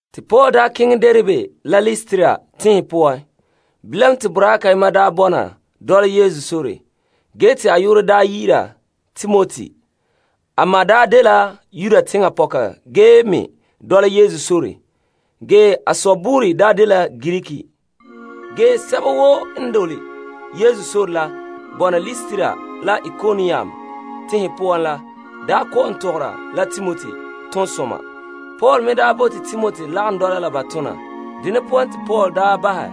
Te Paul keŋɛ Derbe la Listra tenhen poan. Bilam te boraa kayema bɔna dɔla Yesu sore, ge te a yu'urɛ dɛna Timoti. A ma dela Yuda teŋa pɔka ge me dɔla Yesu sore, ge a sɔ dela Greek nɛra. Ge sɛba woo n dole Yesu sore bɔna Listra la Ikonium tenhen poan la kɔ'ɔn tɔgɔra la Timoti toonsoma. Paul me bote Timoti n lagom dɔla la ba tona. Dene poan te Paul bahɛ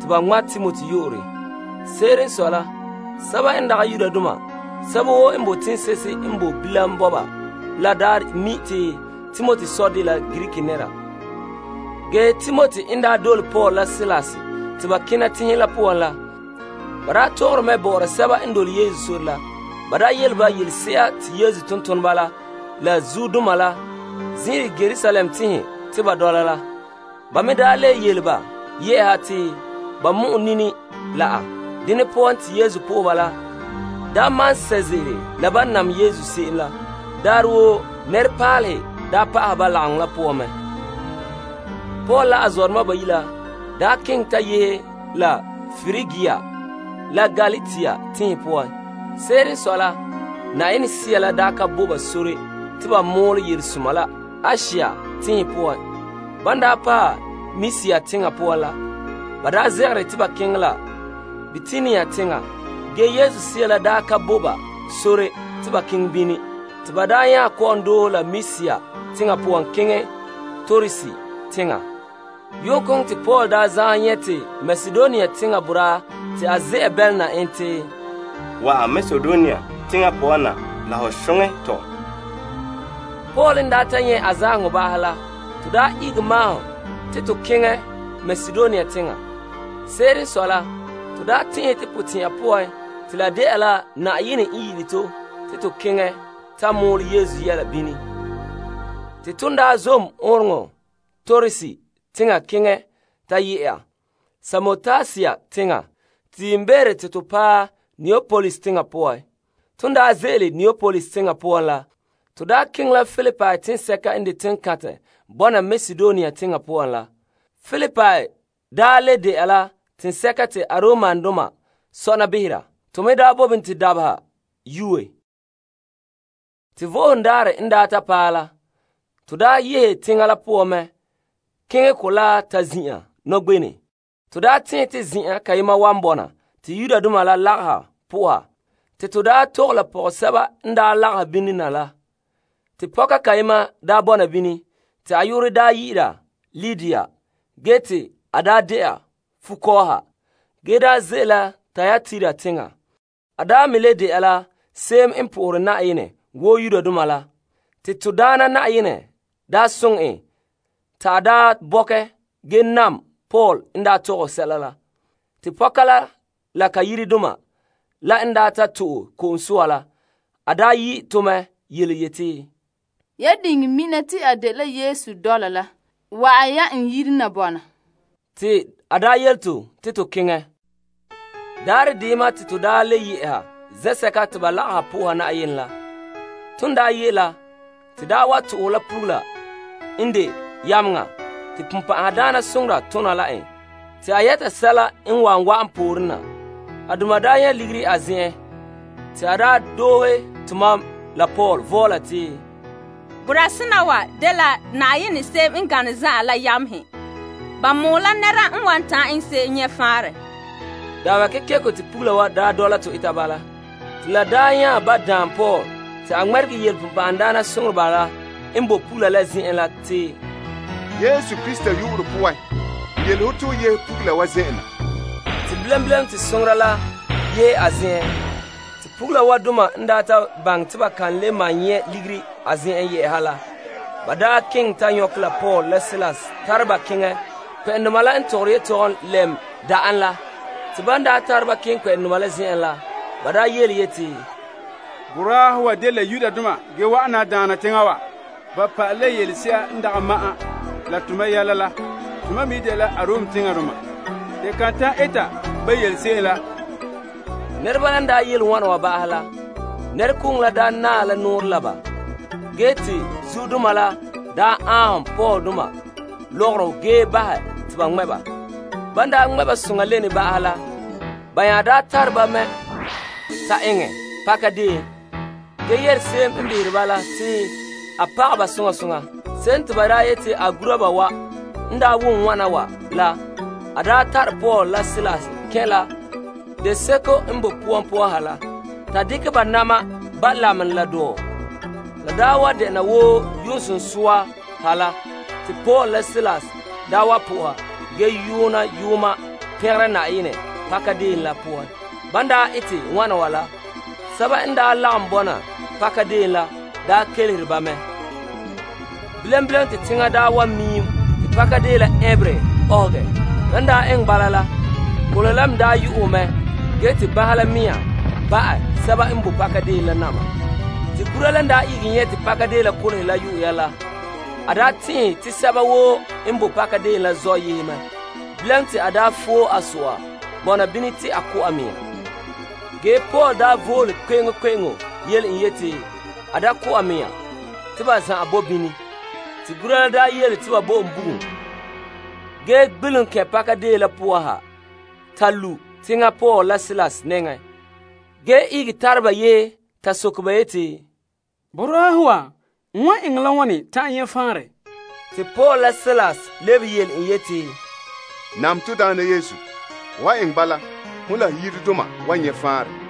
te ba ŋma' Timoti boraanɛ. Se'ere n sɔe la Yudoma sɛba woo n boe teŋse'ehe n boe bilam bɔba la daa mi' te Timoti sɔ dela Greek nɛra. Ge Timoti n dole Paul la Silas te ba kena tenhen la poan la, ba tɔgɔre mɛ bɔ'ɔra sɛba n dole Yesu sore la. Ba yele ba yelese'a te Yesu tontoneba la la zuodoma la zin'ire Yerusalem tɛn'ɛhɛ te ba dɔla la. Ba me le yele ba yɛ'ɛha te ba mɔ'ɛn nini la a. Dene poan te lagaŋɔ la malom sɛ' ze'ele la ban nam Yesu se'em. Daarɛ woo nɛrepaalehe pa'ahe ba lagaŋɔ la poan mɛ. Paul la a zɔdoma bayi' la keŋɛ ta yehe la Prigia la Galatia tenhen poan. Se'ere n sɔe la, Sea la ka bo ba sore te ba mɔɔlɛ Yelesoma la Asia tenhen poan. Ban paɛ Misia teŋa poan la, ba zegere te ba keŋɛ la Bitinia teŋa, ge Yesu Sea la ka bo ba sore te ba keŋɛ bini. Te ba nya kɔ'ɔn doohe la Misia teŋa poan keŋɛ Troas teŋa. Yuunkoŋɔ te Paul zaanhom nyɛ' te Makedonia teŋa boraa te a ze'a bɛlɛna en te, Wa'an Makedonia teŋa poan na la ho soŋɛ tɔ. Paul n ta nyɛ' a zaanheŋɔ ba'ahɛ la to ihege maahom te to keŋɛ Makedonia teŋa. Se'ere n sɔe la to tɛn'ɛhɛ to potɛnha poan te la de'a la Yenɛ n yi'ire to te to keŋɛ ta mɔɔlɛ Yesu Yɛla bini. Te to zom ɔɔnrɔŋɔ kantɛ Troas teŋa keŋɛ ta yehe Samotrake teŋa, te yiimbeere te to paɛ Neapolis teŋa poan. Ton ze'ele Neapolis teŋa poan la, to keŋɛ la Filipi teŋsɛka n de teŋkantɛ bɔna Makedonia teŋa poan la. Filipi le de'a la teŋsɛka te Aromdoma sɔna behera. To me bo bini te dabeha yoe. Te Vo'ohogo Daarɛ n paɛ la, to yehe teŋa la poan mɛ keŋɛ kolaa ta zin'an nɔgbenɛ. To tɛn'ɛhe te zen'an kayema wa bɔna te Yudoma la lagaha po'oha. Pɔgɔhe se'ehe n lagahɛ bini na te to tɔgɛ la ba. Te pɔka kayema bɔna bini. Te a yu'urɛ dena Lidia ge te a de'a fukɔɔha ge ze'ele la Tayatira teŋa. A me le de'a la se'em n po'ohere Yenɛ wo Yudoma la. Te to Daana soŋɛ en te a bɔkɛ ge nam Paul n tɔgɛ sɛla la. Te pɔka la la ka yiredoma la n ta to'e ko'om soa la, a yi' to mɛ yeti, Yamam diŋɛ dekɛ mam te n dɛna Yesu dɔla la, wa'an ya na bɔna n yire. Te a yele to te to keŋɛ. Daarɛ deyema te to le yɛ'ɛha zen'sɛka te ba lagaha po'oha Yenɛ la. Ton ye' la, to to'ohɛ la pugula n de yameŋa te bonbɛ'ɛhe tona la en te a yɛta sɛla n wan wa'an pooren na. A doma nyɛ' ligiri a zen'an. Te a doohe tomam la Paul vɔɔla te, Boraa sena wa dela Yenɛ Se'em N Gane Zan'an la yamehe. Ba mɔɔlɛ la nɛra wan ta'an eŋɛ se'em nyɛ' faanrɛ. Dabeha kekeko te pugula la wa dɔla tɔ eta bala. Te la nya ba daan Paul zo'e zo'e te a ŋmɛregɛ yele bonbɛ'ɛhe la n boe pugula la zen'en te, Yesu Krista yu'urɛ poan n yele ho te ho yehe pugula wa zen'en na. Te bilam bilam te soŋoreba la yehe a zen'en. Te pugula wa doma n ta baŋɛ te ba ka le malom nyɛ' ligiri a zen'en la, ba keŋɛ ta nyɔkɛ Paul la Silas tare ba keŋɛ kpɛ'ɛndoma la n tɔgɔre yetɔgom lɛm da'en la. Te ban tare ba keŋɛ kpɛ'ɛndoma la zen'en la, ba yeti, Boraahe wa dela Yudoma ge wa'an na daana teŋa wa. Ba pa'ala yelese'a n dagɛ ma'an la to yɛla. Tomam me yi' dela Aromdoma. To kan ta'an eta ban yele se'em la. Nɛreba la n yele wana wa ba'ahɛ la, nɛrekooŋɔ la naɛ la nɔɔrɛ la ba, ge te zuodoma la aanhom Paul la Silas lɔgɔrɔ ge bahɛ te ba ŋmɛ' ba. Ban ŋmɛ' ba ba'ahɛ la, ba nya tare ba ta eŋɛ paka deon ge yele se'em n behera ba la te a pagɛ ba soŋa soŋa. Se'em te ba yete a gura la n daa wom wana wa la, a tare Paul la Silas kɛn' la deseko n boe poan poan ha la. Ta dekɛ ba na'ma ba' lamenɛ la dɔɔ. La daa wa dela wo yu'uŋɔ sunsua ha la te Paul la Silas daa wa po'oha ge yoona yooma pɛngera Yenɛ pakadeen la poan. Ban ete wana wa la, sɛba n daa lagom bɔna pakadeen la daa kelehere ba mɛ. Bilam bilam te teŋa miim te pakadeen la ɛnberɛ ugɛhɛ. Lan daa eŋɛ bala la, kolehe la me yu'uhɛ mɛ ge te banhe la mea ba'ɛ sɛba n bo pakadeen la na'ma. Te gura la n ihege nyɛ' te pakadeen la kolehe la yu'uhɛ la, a tɛn'ɛhe te sɛba woo n bo pakadeen la zɔ' yehe mɛ. Bilam te a foe a so'a bɔna bini te a ko' a mea. Ge Paul vole kpe'eŋkpe'eŋo yele en yete a da ko' a mea te ba zan'an boe bini. Te gura la yele te ba bo en bugum ge gbelom kɛn' pakadeen la poan ha ta lu' teŋa Paul la Silas nɛŋa, ge ihege tare ba yehe ta soke ba yeti, Boraahe wa, n wan eŋɛ la wane ta'an nyɛ' faanrɛ? Te Paul la Silas lebehe yele en yeti, Nam to Daana Yesu. Ho han eŋɛ bala, hon la ho yiredoma wan nyɛ' faanrɛ.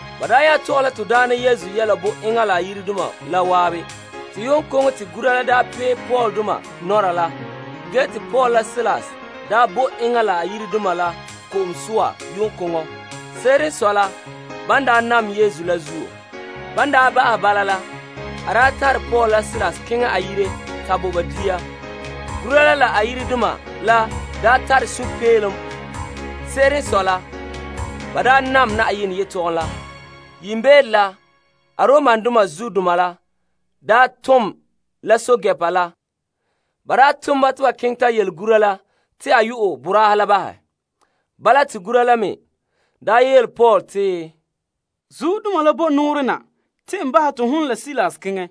Ba nya tɔgɛ la to Daana Yesu yɛla bo enŋa la a yiredoma la zan'an. Yu'uŋkoŋɔ te gura la pee Paul la Sila nɔra la. Ge te Paul la Silas bo enŋa la a yiredoma la ko'om soa yu'uŋkoŋɔ. Se'ere n sɔe la, ban nam Yesu la zuo. Te a tare Paul la Silas keŋɛ a yire ta bo ba dia. Gura la la a yiredoma la tare sunpeelom. Se'ere n sɔe la ba nam Yenɛ yetɔgom la. Yiimbeere la, Aromdoma zuodoma la tom la pɛɛntɛɛnreba la. Ba tom ba te ba keŋɛ ta yele gura la te a yu'ɛ boraahe la bahɛ. Bala te gura la me yele Paul te, Zuodoma la bo nɔɔrɛ na te n bahɛ te hon la Silas keŋɛ.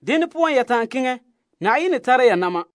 Dene poan ya ta'an keŋɛ. Yenɛ tara ya na'ma.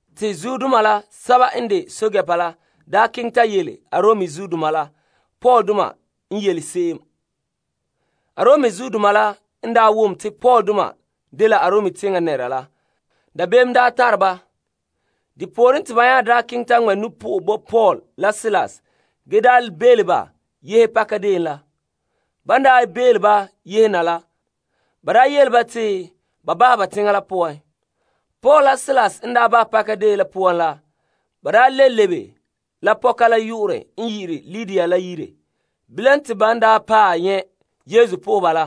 Te zuodoma sɛba n de pɛɛntɛɛnreba la keŋɛ ta yele Arom zuodoma la Paul la Silas la n yele se'em. Arom zuodoma la n wom te Paul la Silas dela Arom teŋa nɛreba la, dabeem n tare ba. Depooren, te ba nya keŋɛ ta ŋmɛ' nu'po'ɔ bo Paul la Silas ge bele ba yehe pakadeen la. Ban bele ba yehe na la, ba yele ba te ba bahɛ teŋa la poan. Paul la Silas la n bahɛ pakadeen la poan la, ba le lebe la Lidia yire. Bilam te ban paɛ nyɛ' Yesu po'oheba la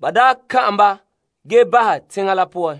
ba tɔgɛ kpemehe ba ge bahɛ teŋa la poan.